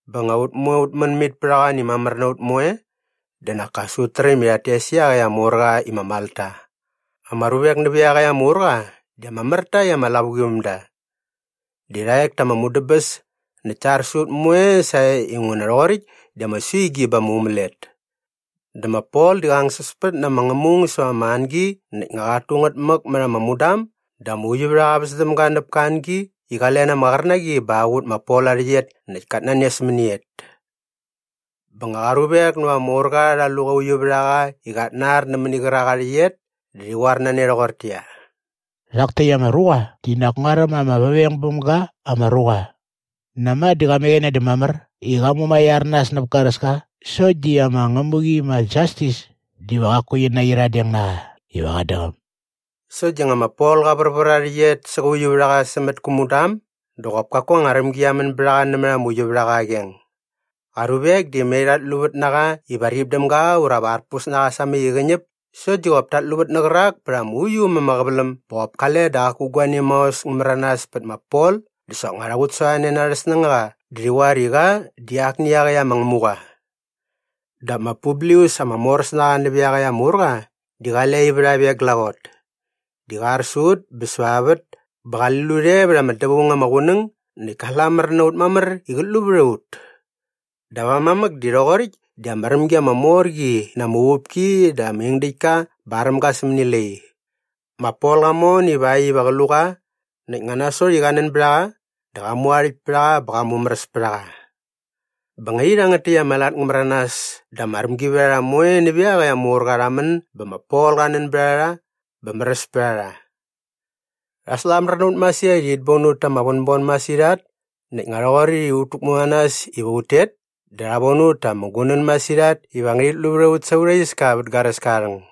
Bä nga ut moe ut män mit pät a qoan i mamär na ut moe dä nak as ut räm i rhat tes iaqäkt ama urqa i ma Malta. Ama ruvek nävä iaqäkt ama urqa di ama mär ta i ama lavuqivämda. Di rha ek ta ama mudäbäs näkt ta ar sä ut moe sae inguna rhoqoräkt di ama suigi bä ama umälet. Dä ma Pol di qa angsäspät na ama ngämung säva ama angi näkt nga qat tu ngät mäk mät ama mudam dä ama uiuvärhaqa väs däm ga näp ka angi i qa len ama qärnaqi bä qa qut ma Pol aa rhäqyet näkt kat nanes mäni et. Bä nga qa ruvek näva ama urqa rha lu qä uiuvärhaqa i qat nar nämäni qärak aa rhäqyet dä rhi qoar na ne rhoqortäqyia, “Rhak täkt ama ruqa di nak nguaräm ama väveng bäm ga ama ruqa. Näma dä qa mäqäne dä mamär i qa mumaiar nas näp garäska sokt di ama ngämuqi ma Jastis diva qaku qi naqyiradeng na qa iva qat däqäm.” Sokt di nga ma Pol qa värvär aa rhäqyet sä qä uiuvärhaqa sämät kä mudam dä qop kaku anga rämgi qia män bät a qa nämät ama uiuvärhaqa aa qeng. Qa ruvek di mai rhat luvät na qa iva rip däm ga ura va arpus na qa samäk i qä ñäp sokt di qop tat luvät nä qärak pät ama uiu äm ama qäväläm bä qop kale dä qaku guani maos ngä märanas pät ma Pol dä soknga rha qutsasorhane na arhä snängaqa dä rhi qoar i qa di akni iaqäkt ama ngämuqa. Dap ma Publius ama moräsnaqa nävä iaqäkt ama urqa di qale aa ivärhap e glaqot. Di qa ar sä ut bä säva aa vät bä qali lut e vät ama dävaung ama qunäng näkt ka slamär na ut mamär i qät lu vät a ut. Dap aa mamäk di rhoqoräkt di ama rämgi ama mor qi na ama uvupki dä ama ingdäktka bä aräm ga sämäni lai. Ma Pol qa mon ivakt iva qä lu qa näkt nga nasot i qa nän bät a qa dä qa mu aa rhäkt pät a qa bä qa mumäräs pät a qa. Bä nga i rhangät täkt ama lat ngä märanas dä ama rämgivärharha moe nävä iaqäkt ama urqa rha män bä ma Pol qa nän bät a rha bä märäs pät a rha. Rha slamär na ut masirhat i rhit bon ut ta ama vänbon masirhat näkt nga rhoqoräkt i ut täkmu na nas iva ut tet dä rha von ut ta ama gunän masirhat iva ngärhit lu vät a ut sa aurha iska vät garäska aa rhäng.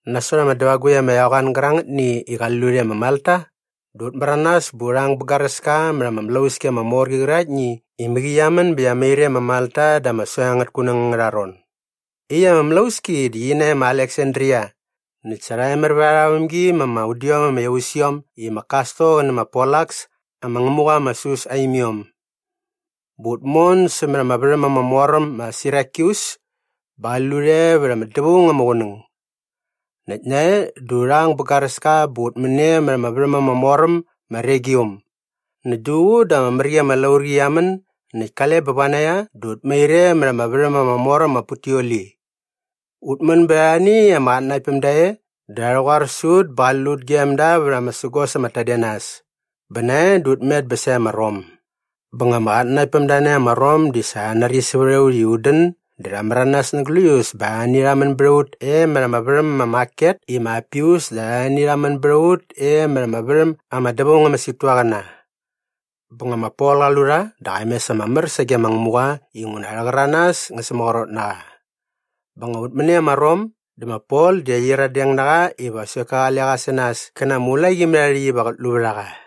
Nasot ama dävagukt ama eqoan gärangätni i qali lut e ma Malta dä ut märanas bä urha ang bä garäska mät ama mlauski ama mor qi qäraktni i mäqi qia män bä qia mair e ma Malta da ama soeng angät kunäng angärha ron. Iaqyäkt ama mlauski di qi nae ma Aleksandria näkt sa rha emär vät arha vämgi ma ama udiom ama iausiom i ma Kastor qä nä ma Polaks ama ngämuqa ma Sus aa imiom. Bä ut mon sämät ama värhäm ama mor äm ma Sirakyus bä qali lut e vät ama dävaung ama qunäng. Näkt nae dä u rhang bä garäska bä ut män e mät ama värhäm ama mor äm ma Regium. Näkt duququ dä ama mär qi ama laurqi qia män näkt kale bä vanaia dä ut mair e mät ama värhäm ama mor äm ma Puteoli. Ut män bät arhani ama qatnanaktpämda e dä rha rhäqoar sä ut bä qali lut gem da vät ama sägos ama tadenas. Bä nae dä ut met bä sae ma Rom. Bä nga ama qatnanaktpämda nae ma Rom di sa rha nari sävät a ut i ut dän dä rha märanas na gläius bä arhani rha män bät a ut e mät ama värhäm ma Maket i ma Apius dä arhani rha män bät a ut e mät ama värhäm ama Dävaung ama Situaqäna. Bä nga ma Pol qa lu rha dä qa mes ama mär sage ma Ngämuqa inguna arhä qäranas äs ngä sämaqrot na qa. Bä nga ut män e ma Rom dä ma Pol di rha qyiradeng na qa iva sokt ka qale qa sä nas kä na ama ulaqimärhaarhäkt iva qät lu vät a qa.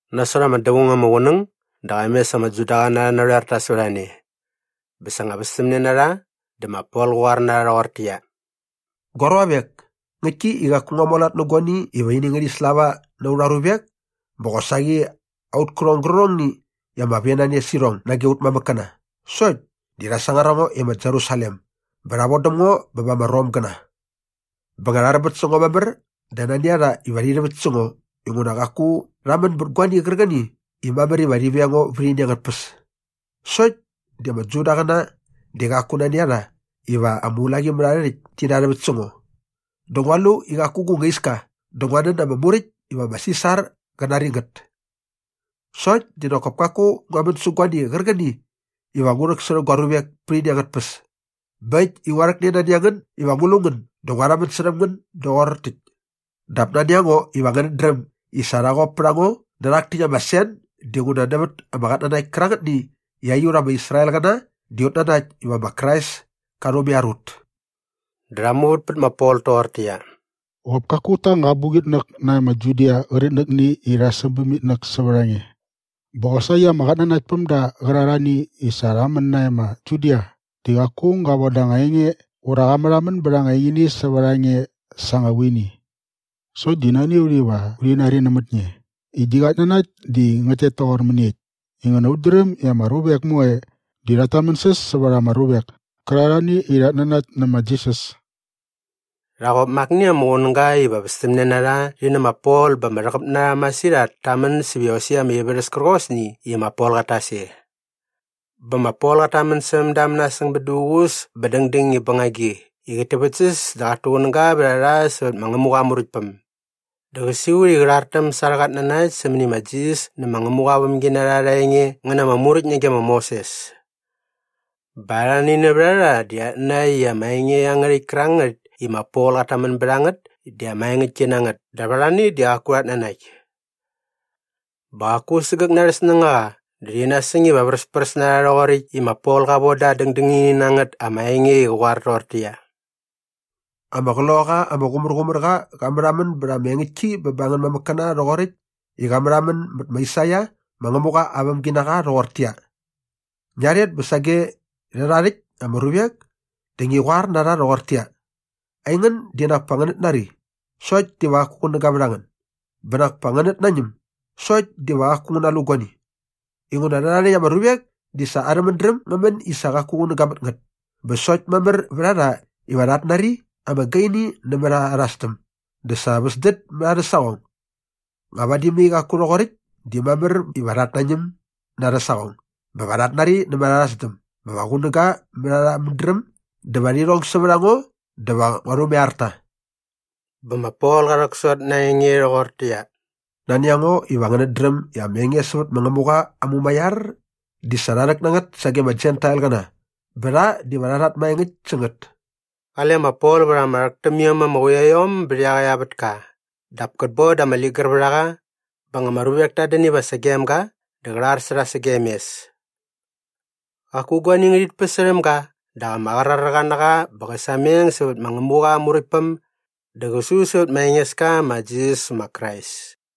Nasot ama dävaung ama qunäng dä qa mes ama Judaqäna arhä narhoerta sävät a ne. Bä sa nga västämne na rha dä ma Pol qä qoar na rha rhoqortäqyia, “Gua ruavek, ngäktki i qaku ngua mualat nä guani iva ini ngärhi slava na aurha ruvek bä qosaqi aut kärhong gärqärhongni i ama venane sä irhong nage aut mamäkkäna sokt di rha sangar a ngo e ma Jerusalem bä rha vodäm ngo bä ba ama Romgäna. Bä nga rha rämbät sä ngo mamär dä nani a rha iva rhi rhäväkt sä ngo inguna qaku rha män bät guani qärqäni i mamär iva rhi veng ngo vät ini angät tpäs. Sokt di ama Judaqäna di qaku nani a rha iva ama ulaqimärharhärhäkt ti narhäväkt sä ngo dä ngua lu i qaku gu nga iska dä ngua nän da ama muräkt iva ma Sisar qä nari ngät. “Sokt di nak kop kaku ngua män sä guani qärqäni iva ngu rhäksärhä gua ruvek pät ini angät tpäs. Bä äkt i ngua rhäkne nani a ngän iva ngu lu ngän dä ngua rhamän särhäm ngän doqor täkt. Dap nani a ngo iva ngänät dräm i sa rha qop pät a ngo nä rhak täkt ama sen dinguna nävät ama qatnanakt kärangätni i aiut ama Israelqäna di ut nanakt iva ma Krais ka rhumaiar ut.” Dä rha muvät pät ma Pol toqortäqyia, “Qop kaku ut ta anga abuqitnäk nae ma Judia qärqitnäkni i rha säm bäm itnäk sävät a nge. Bä qosaqi ama qatnanaktpämda qärarhani i sa rha män nae ma Judia di qaku aung ga voda anga enge ura qa märhamän bät anga engini sävät a nge sa anga vuini. Sokt di nani a ut iva urhi nari nämät nge i gi qatnanakt di ngät tet toqor mäniekt inguna ut dräm i ama ruvek moe di rhat tamänsäs sävät ama ruvek kärarhani i rhat nanakt nä ma Jisas.” Rha qop ma akni ama qunäga iva västämne na rha rhi nä ma Pol bä ama rhäqäp na rha masirhat ta män säp iosäkt ama ivärhäs kärqosni i ma Pol qat tas e. Bä ma Pol qat tamän särhäm da mänasäng bät duququs bä dängdäng i bängagi i qät täväktsäs dä qat tuqunäga vät a rha sävät ma Ngämuqa aa Muräktpäm. Dä qä siqut i qä rhartäm sa arhä qatnanakt sämäni ma Jisas nä ma Ngämuqa aa vämginarha arha enge ngä na ama Muräkt nage ma Moses. Bä arhani nävät a rha di rhat nanakt i ama enge iangärhäkt kärangät i ma Pol qat tamän bät a ngät di ama engäktki na ngät dap arhani di qaku rhat nanakt. Bä qaku sägäk na arhä snängaqa dä rhi nasäng iva vräspräs na rha rhoqoräkt i ma Pol qa voda aa dängdängini na ngät ama enge i qä qoar toqortäqyia, “Ama Qloqaqa ama Qumärqumärqa qa märhamän bät ama engäktki bä ba angän mamäkkäna rhoqoräkt i qa märhamän mät ma Aisaia ma Ngämuqa aa vämginaqa rhoqortäqyia, “‘Ngia rhet bä sage rhärhae rhäkt ama ruvek dä ngi qoar na rha rhoqortäqyia, “Aingän di nak pa ngänät nari sokt diva qaku qunäga vät a ngän bä nak pa ngänät nañäm sokt diva qaku ngän nalu guani.” Inguna rhärhae rhäkt ama ruvek di sa arhä mädräm ngä män i sa qaku qunäga mät ngät bä sokt mamär vät a rha iva rhat nari ama gaini nämät arha sdäm dä sa rha väsdät mät arhä saqong. Nga vadi mai qaku rhoqoräkt di mamär iva rhat nañäm na arhä saqong bä va rhat nari nämät arha sdäm bä va qunäga mät arhä mädräm dä va rhi rhong sävät a ngo dä va ngua rhumaiar ta.’” Bä ma Pol qa rhäksot na aa enge rhoqortäqyia, “Nani a ngo iva ngänät dräm i ama enge sävät ma Ngämuqa aa mumaiar di sa qa rhäk na ngät sage ama Jentailqäna bä rha diva rha rhat maengäkt sä ngät.” Qale ma Pol vät ama rhäk täm iom ama quiaiom bät iaqäkt aa vätka dap kät boda ama ligär vät a qa bä nga ama ruvek tat dän iva sagem ga dä qä rhar sä rha sagem mes. Qaku guani ngärhit päsärhäm ga dap ama qraräqa na qa bä qä sameng sävät ma Ngämuqa aa Muräktpäm dä qä su sävät ma Engeska ma Jisas ma Krais.